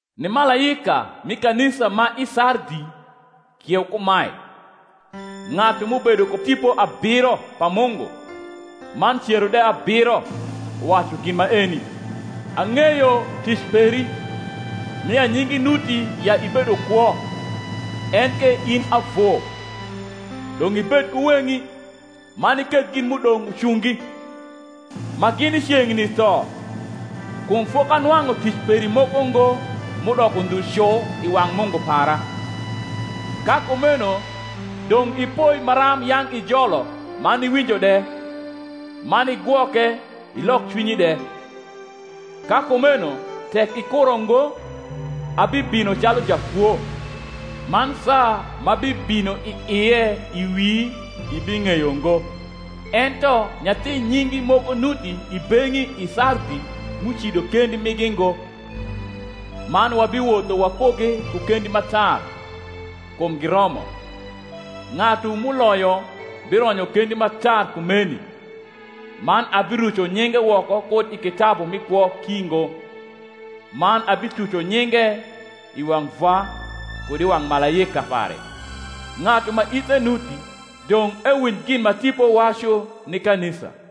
Ni malaika mi kanisa ma i Sardi kieu kumae: Ng’atu m’ubedo ku Tipo abiro pa Mungu, man cero de abiro, uwacu gin maeni: Ang’eyo tic peri, nia nyingi nuti ya ibedo kwo, enke in avu. Dong’ ibed ku weng’i, man iketh gin m’udong’ ucungi, ma gini ceng’ni tho: kum fokanwang’u tic peri moko ngo m’udoko ndhu cu i wang’ Mungu para. Ka kumeno dong’ ipoi maram yang’ ijolo man iwinjo de; man igwoke, ilok cwinyi de. Ka kumeno tek ikuro ngo, abibino calu jakwo, man saa m’abibino i ie i wi ibing’eyo ngo. Ento nyathi nyingi moko nuti i beng’i i Sardi m’ucido kendi migi ngo: man wabiwotho wakugi ku kendi ma tar; kum giromo. Ng’atu m’uloyo bironyo kendi ma tar kumeni; man abiruco nyinge woko kud i kitabu mi kwo ki ngo, man abituco nyinge i wang’ Vwa, kud i wang’ malaika pare. Ng’atu ma ithe nuti, dong’ ewinj gin ma Tipo wacu ni kanisa.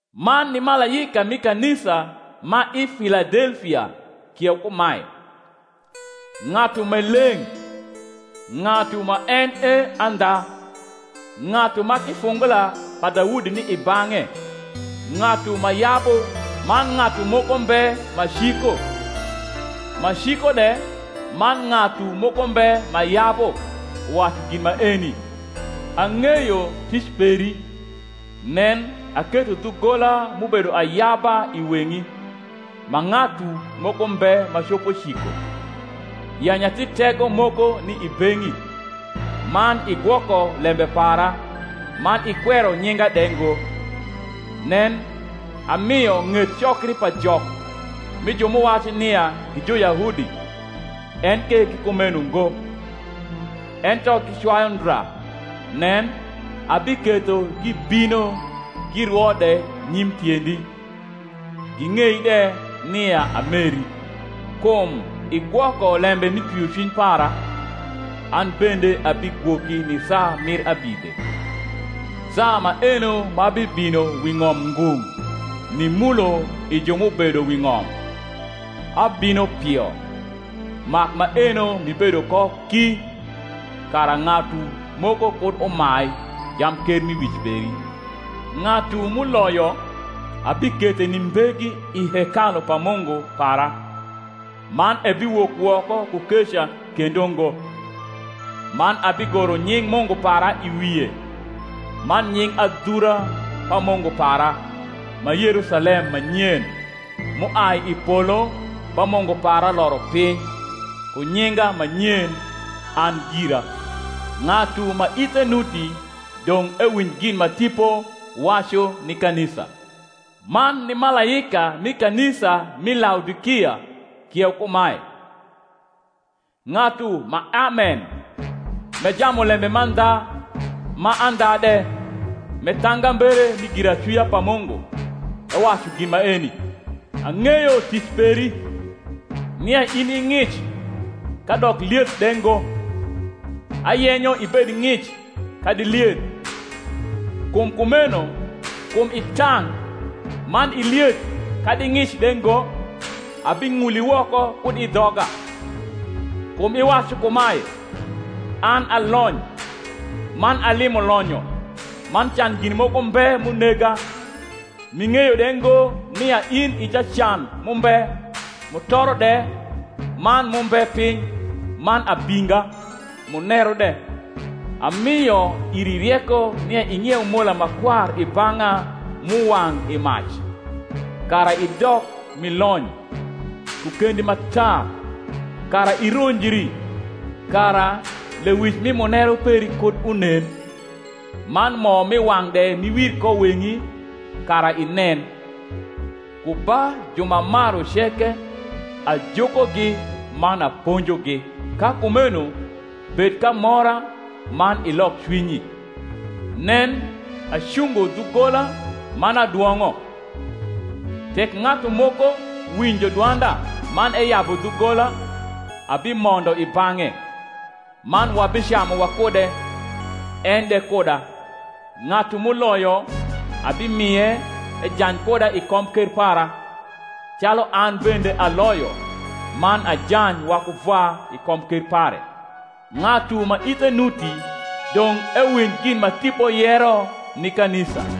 Man ni malaika mi kanisa ma i Filadellia kieu kumae: Ng’atu m’e leng’, ng’atu ma en e andha, ng’atu ma kifungula pa Daudi ni i bang’e, ng’atu ma yabu man ng’atu moko mbe ma ciko, ma ciko de man ng’atu moko mbe ma yabu, uwacu gin maeni: Ang’eyo tic peri (nen, aketho dhugola m’ubedo ayaba i weng’i, ma ng’atu moko mbe ma copo ciko), ya nyathi tego moko ni i beng’i, man igwoko lembe para, man ikwero nyinga de ngo. Nen, amio ng’et cokri pa Jok, mi ju m’uwacu nia gi Juyahudi, enke gi kumeno ngo, ento gicwayu ndra; nen, abiketho gibino girwo de nyim tiendi, ging’ei de nia ameri. Kum igwoko lembe mi twiocwiny para, an bende abigwoki ni saa mir abidhe, saa maeno ma bibino wi ng’om ngung’, nimulo i ju m’ubedo wi ng’om. Abino pio: mak maeno m’ibedo ko ki, kara ng’atu moko kud umai jamkermiwic peri. Ng’atu m’uloyo, abikethe ni mbegi i hekalu pa Mungu para, man ebiwok woko ku keca kendo ngo: man abigoro nying’ Mungu para i wie, man nying adhura pa Mungu para, ma Yerusalem ma nyen, m’uai i polo ba Mungu para loro piny, ku nyinga ma nyen an gira. Ng’atu ma ithe nuti, dong’ ewinj gin ma Tipo wacu ni kanisa. Man ni malaika mi kanisa m’i Laodikia kieu kumae: Ng’atu ma Amen, m’e jamulembe mandha ma andha de, m’e thangambere mi giracwia pa Mungu, ewacu gin maeni: Ang’eyo tic peri, nia in i ng’ic kadok lieth de ngo: ayenyo ibed ng’ic kadi lieth. Kum kumeno kum i tang’, man i lieth kadi ng’ic de ngo, abing’uli woko kud i dhoga. Kum iwacu kumae, An a lony, man alimo lonyo, man can gin moko mbe m’unega; m’ing’eyo de ngo nia in i jacan m’umbe mutoro de man m’umbe piny man abinga, muneru de: amio iri rieko nia ing’ieu mola ma kwar i bang’a m’uwang’ i mac, kara idok m’i lony; ku kendi ma tar, kara ironjri, kara lewic mi muneru peri kud unen: man mo m’i wang’ de m’iwir ko weng’i, kara inen. Ku ba ju m’amaru ceke, ajukogi man aponjogi: ka kumeno bed k’amora, man ilok cwinyi. Nen, acungo dhugola man adwong’o: tek ng’atu moko winjo dwanda man eyabu dhugola, abimondo i bang’e, man wabicamu wakude, en de kuda. Ng’atu m’uloyo, abimie ejany kuda i komker para, calu an bende aloyo, man ajany waku Vwa i komker pare. Ng’atu ma ithe nuti, dong’ ewinj gin ma Tipo yero ni kanisa.